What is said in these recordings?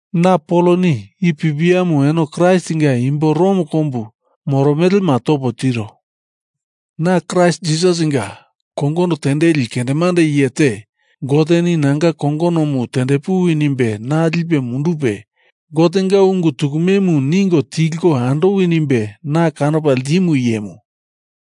Na Poloni i pipiamu eno Kraistinga imbo Rom kombu moromelema topo tiro, na Kraist Jisasinga kongono tendeli kendemande iye te, Goteni nanga kongonomu tendepuwi nimbe na lipe mundupe, Gotenga ungu tukumemu ningo tilko andowi nimbe na kanopa ltimu iyemu.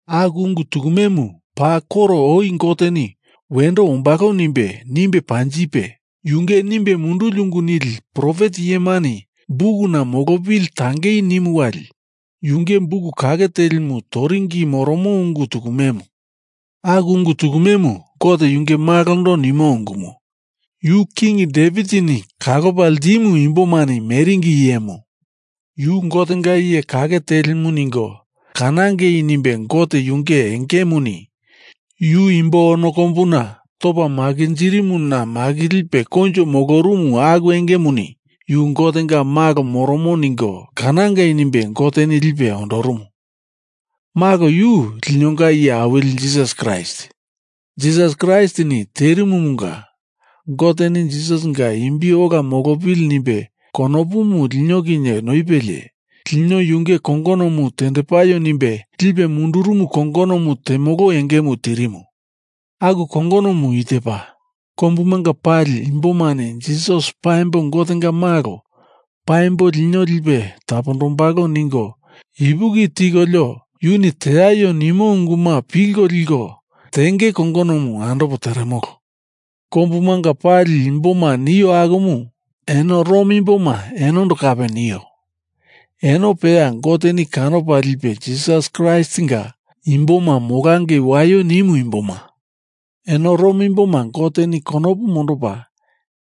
Aku ungu tukumemu paa koro oi Goteni wendo ombalo nimbe, nimbe panjipe, yunge nimbe munduli ungu nili profet iyemani bukuna molopili tangei nimu wali yunge buk kake telimu toringi moromo ungu tukumemu. Aku ungu tukumemu Gote yunge Malondo nimo ungumu. Yu King Devitini kalopa ltimu imbomani meringi iyemu. Yu Gotenga iye kake telimu ningo kanangei nimbe Gote yunge engemuni yu imbo ono kombuna topa makinjirimuna makilipe koinjo molorumu aku engemuni yu Gotenga Malo moromo ningo kanangei nimbe Goteni lipe ondorumu. Malo, yu linonga Iye Awili Jisas Kraist. Jisas Kraistini terimumunga Goteni Jisasinga imbi ola molopili nimbe konopumu lino kinye noipelie lino yunge kongonomu tendepaio nimbe lipe mundurumu kongonomu temolo engemu tirimu. Aku kongonomu i tepa: Kombumanga pali imbomani Jisas paimbo Gotenga Malo, paimbo lino lipe tapombalo ningo ipuki tikolio yuni teaio nimo unguma pilko liko tenge kongonomu andopo teremolo. Kombumanga pali imboma nio akumu eno Rom imboma enondo kape nio. Eno peya Goteni kanopa lipe Jisas Kraistinga imboma molangei waio nimu imboma. Eno Rom imboma Goteni konopu mondopa,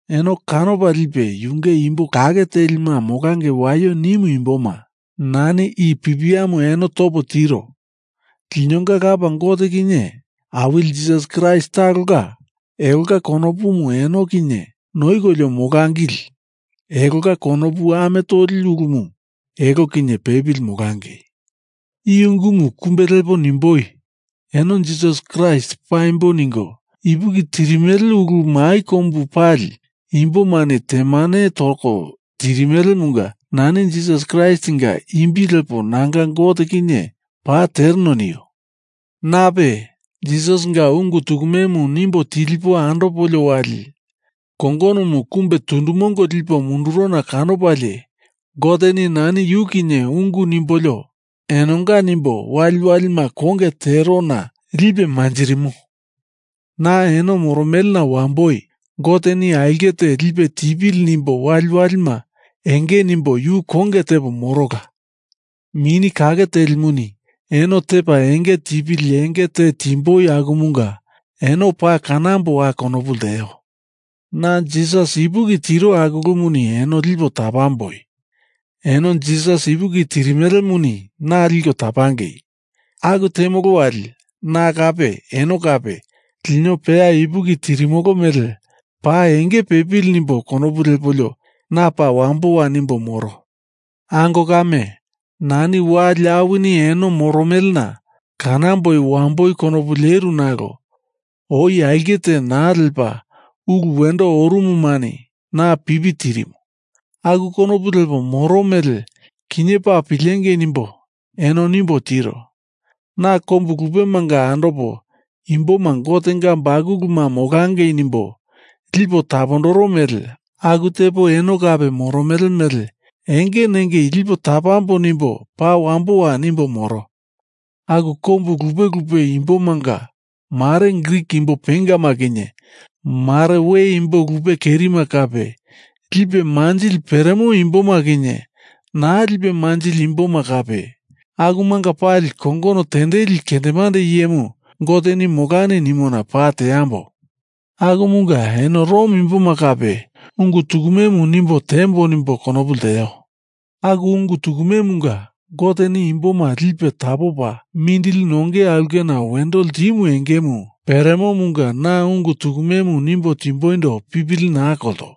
eno kanopa lipe Yunge imbo kake telima molangei waio nimu imboma nani i pipiamu eno topo tiro. Linonga Lapa Gote kinye Awili Jisas Kraist talonga elonga konopumu eno kinye noikolio molangili, elonga konopu ame toli ulumu eno kinye pepili molangei. I ungumu kumbe lepo nimboi, eno Jisas Kraist paimbo ningo ipuki tirimele ulu mai kombu pali imbomani temane toko tirimelemunga nani Jisas Kraistinga imbi lepo nanga Gote kinye paa tereno nio. Nape, Jisasinga ungu tukumemu nimbo tilipo andopolio wali kongonomu kumbe tundu mongo lipo mundurona kanopalie Goteni nani yu kinye ungu nimbolio enonga nimbo waliwalima konge terona lipe manjirimo. Na eno moromelena wamboi Goteni aulke te lipe tipili nimbo waliwalima enge nimbo yu konge tepo morola. Mini Kake Telimuni eno tepa enge tipili enge te timboi akumunga eno paa kanamboa konopu lteo. Na Jisas ipuki tiro aku ulumuni eno lipo tapamboi. Eno Jisas ipuki tirimelemuni na liko tapangei. Aku temolo wali na kape eno kape lino peya ipuki tirimolo mele paa enge pepili nimbo konopu lepolio na paa wamboa nimbo moro. Ango kame, nani wali awini eno moromelena kanamboi wamboi konopu leru nalo oi aulke te naa lepa ulu wendo orumumani na pipi tirimu, aku konopu lepo moro mele kinye paa pilengei nimbo eno nimbo tiro. Na kombu lupemanga andopo imboma Gotenga bakuluma molangei nimbo lipo tapondoro mele aku tepo eno kape moromele mele enge nengei lipo tapambo nimbo paa wamboa nimbo moro. Aku kombu lupe lupe imbomanga mare Grik imbo pengama kinye mare we imbo lupe kerima kape, lipe manjili peremo imboma kinye naa lipe manjili imboma kape, akumanga pali kongono tendeli kendemande iyemu Goteni molani nimona paa teambo. Akumunga eno Rom imboma kape ungu tukumemu nimbo tiembo nimbo konopu lteo. Aku ungu tukumemunga Goteni imboma lipe tapopa mindili nonge aulkena wendo ltimo engemu peremomunga na ungu tukumemu nimbo timboindo pipili naa kolto.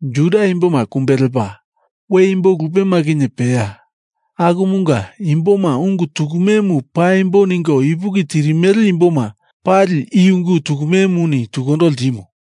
Juda imboma kumbe lepa, we imbo lupema kinye peya, akumanga imboma ungu tukumemu paimbo ningo ipuki tirimele imboma pali i ungu tukumemuni tukundo ltimo.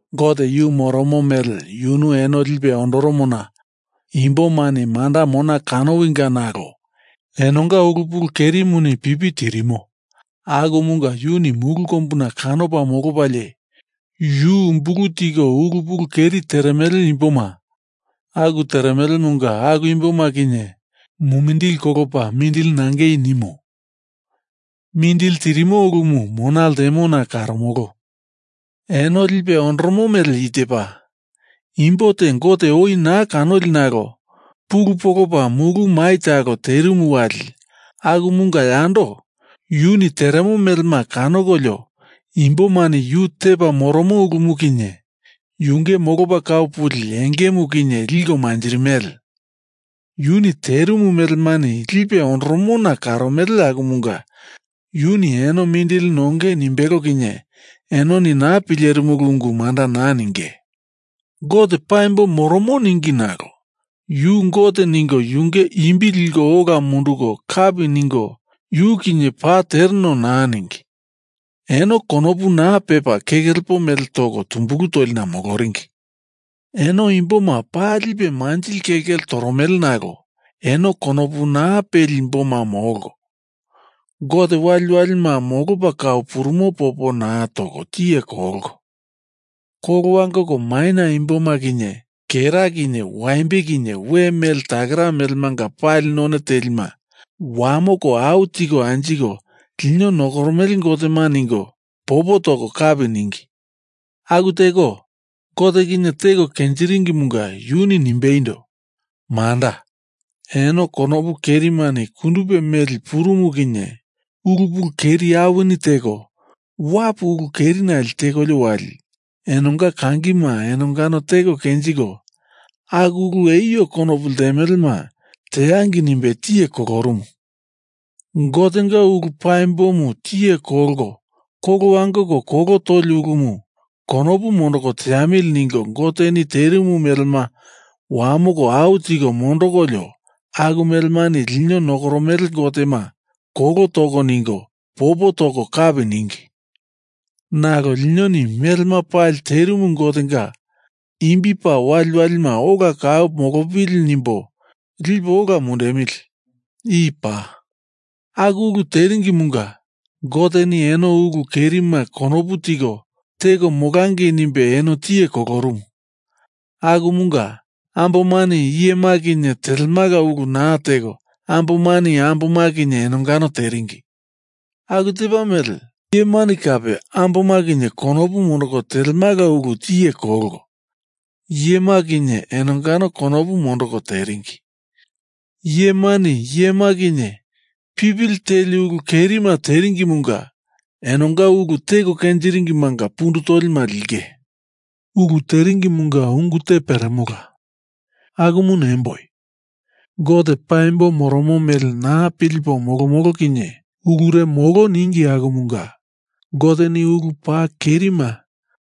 Gote yu moromo mele yunu eno lipe ondoromona imbomani manda mona kanowinga nalo enonga ulu pulu kerimuni pipi tirimo akumunga yuni mulu kombuna kanopa molopalie yu umbulu tiko ulu pulu keri teremele imboma aku teremelemunga aku imboma kinye mumindili kolopa mindili nangei nimo. Mindili tirimo ulumu mona ltemona karomolo. Eno lipe ondoromo mele i tepa, Imbo te Gote oi naa kanoli nalo pulu polopa mulu mai talo terimu wali akumunga yando yuni teremo melema kanokolio imbomani yu tepa moromo ulumu kinye yunge molopa kau puli engemu kinye liko manjirimele. Yuni terimu melemani lipe ondoromona karomele akumunga yuni eno mindili nongei nimbelo kinye enoni naa pilerimulu ungu manda naa ninge. Gote paimbo moromo ningi nalo yu Gote ningo yunge imbi liko ola munduko kapi ningo yu kinye paa tereno naa ningi, eno konopu naa pepa keke lepo mele toko tumbulu tolina moloringi. Eno imboma paa lipe manjili kelkele toromele nalo eno konopu naa peli imboma molko, Gote waliwalima molopa kau purumo popo naa toko tiye kolko, kolo wangoko maina imboma kinye kera kinye waimbe kinye we mele takera melemanga pali none telima wamoko au tiko anjiko lino nokoromele gotema ningo popo toko kapi ningi. Aku teko Gote kinye teko kenjiringimunga yuni nimbeindo, manda, eno konopu kerimani kundupe meli purumu kinye ulu pulu keri awini teko wapu ulu kerinale tekolio wali enonga kangima enongano teko kenjiko, aku ulu eio konopu ltemelema teangei nimbe tiye kolorumu. Gotenga ulu paimbomu tiye kolko kolo wangoko kolo toli ulumu konopu mondoko teamili ningo, Goteni terimu melema wamoko au tiko mondokolio aku melemani lino nokoromele gotema kolo toko ningo popo toko kapi ningi. Nalo linoni melema pali terimu Gotenga imbi paa waliwalima ola kau molopili nimbo lipo ola mundemili. I paa. Aku ulu teringimunga Goteni eno ulu kerima konopu tiko teko molangei nimbe eno tiye kolorumu. Akumunga ambomani iyema kinye telemala ulu naa teko ambomani amboma kinye enongano teringi. Aku tepa mele iyemani kape amboma kinye konopu mondoko telemala ulu tiye kolko, iyema kinye enongano konopu mondoko teringi. Iyemani iyema kinye pipili teli ulu kerima teringimunga enonga ulu teko kenjiringimanga pundu tolima linge. Ulu teringimunga ungu te peremola, akumu nemboi. Gote paimbo moromo mele naa pilipo molomolo kinye ulure molo ningi akumunga Goteni ulu paa kerima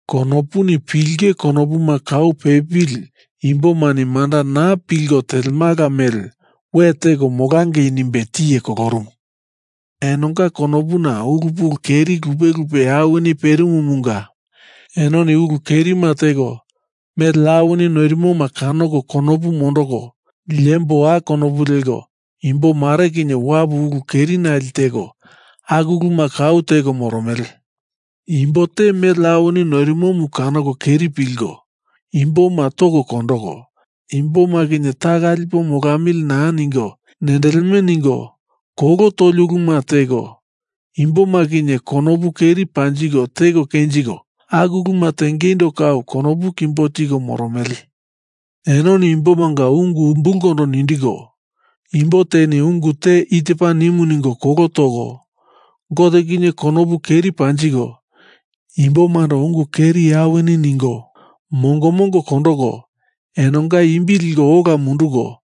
konopuni pilinge konopuma kau pepili imbomani manda naa pilko telemala mele we teko molangei nimbe tiye kolorumu. Enonga konopuna ulu pulu keri lupe lupe awini perimumunga enoni ulu kerima teko, mele awini noirimoma kanoko konopu mondoko liemboa konopu leko, imbo mare kinye wapu ulu kerinale teko, aku uluma kau teko moromele. Imbo te mele awini noirimomu kanoko keri pilko, imboma toko kondoko, imboma kinye taka lipo molamili naa ningo nendeleme ningo, kolo toli uluma teko, imboma kinye konopu keri panjiko teko kenjiko, aku uluma tengeindo kau konopu kimbo tiko moromele. Enoni imbomanga ungu umbulkondo nindiko, imbo teni ungu te i tepa nimu ningo kolo toko, Gote kinye konopu keri panjiko, imbomando ungu keri awini ningo, mongo mongo kondoko enonga imbi liko ola munduko,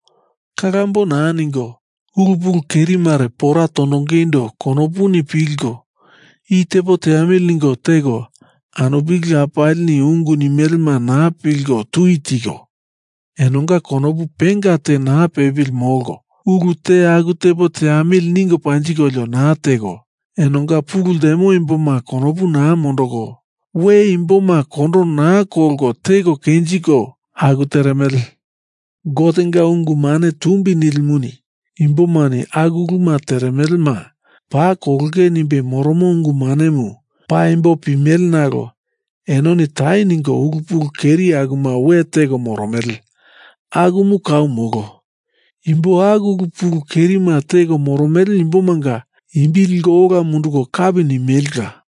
kalambo naa ningo, ulu pulu keri mare pora tondongeindo konopuni pilko i tepo teamili ningo teko, anupili lapalini ungu nimelema naa pilko tui tiko, enonga konopu penga te naa pepili molko, ulu te aku tepo teamili ningo panjikolio naa teko, enonga pulu ltemo imboma konopu naa mondoko, we imboma kondo naa kolko teko kenjiko, aku teremele. Gotenga ungu mane tumbi nilimuni imbomani aku uluma teremelema paa kolonge nimbe moromo ungu manemu paimbo pimele nalo enoni tai ningo ulu pulu keri akuma we teko moromele. Akumu kau molo. Imbo aku ulu pulu kerima teko moromele imbomanga imbi liko ola munduko kapi nimelela.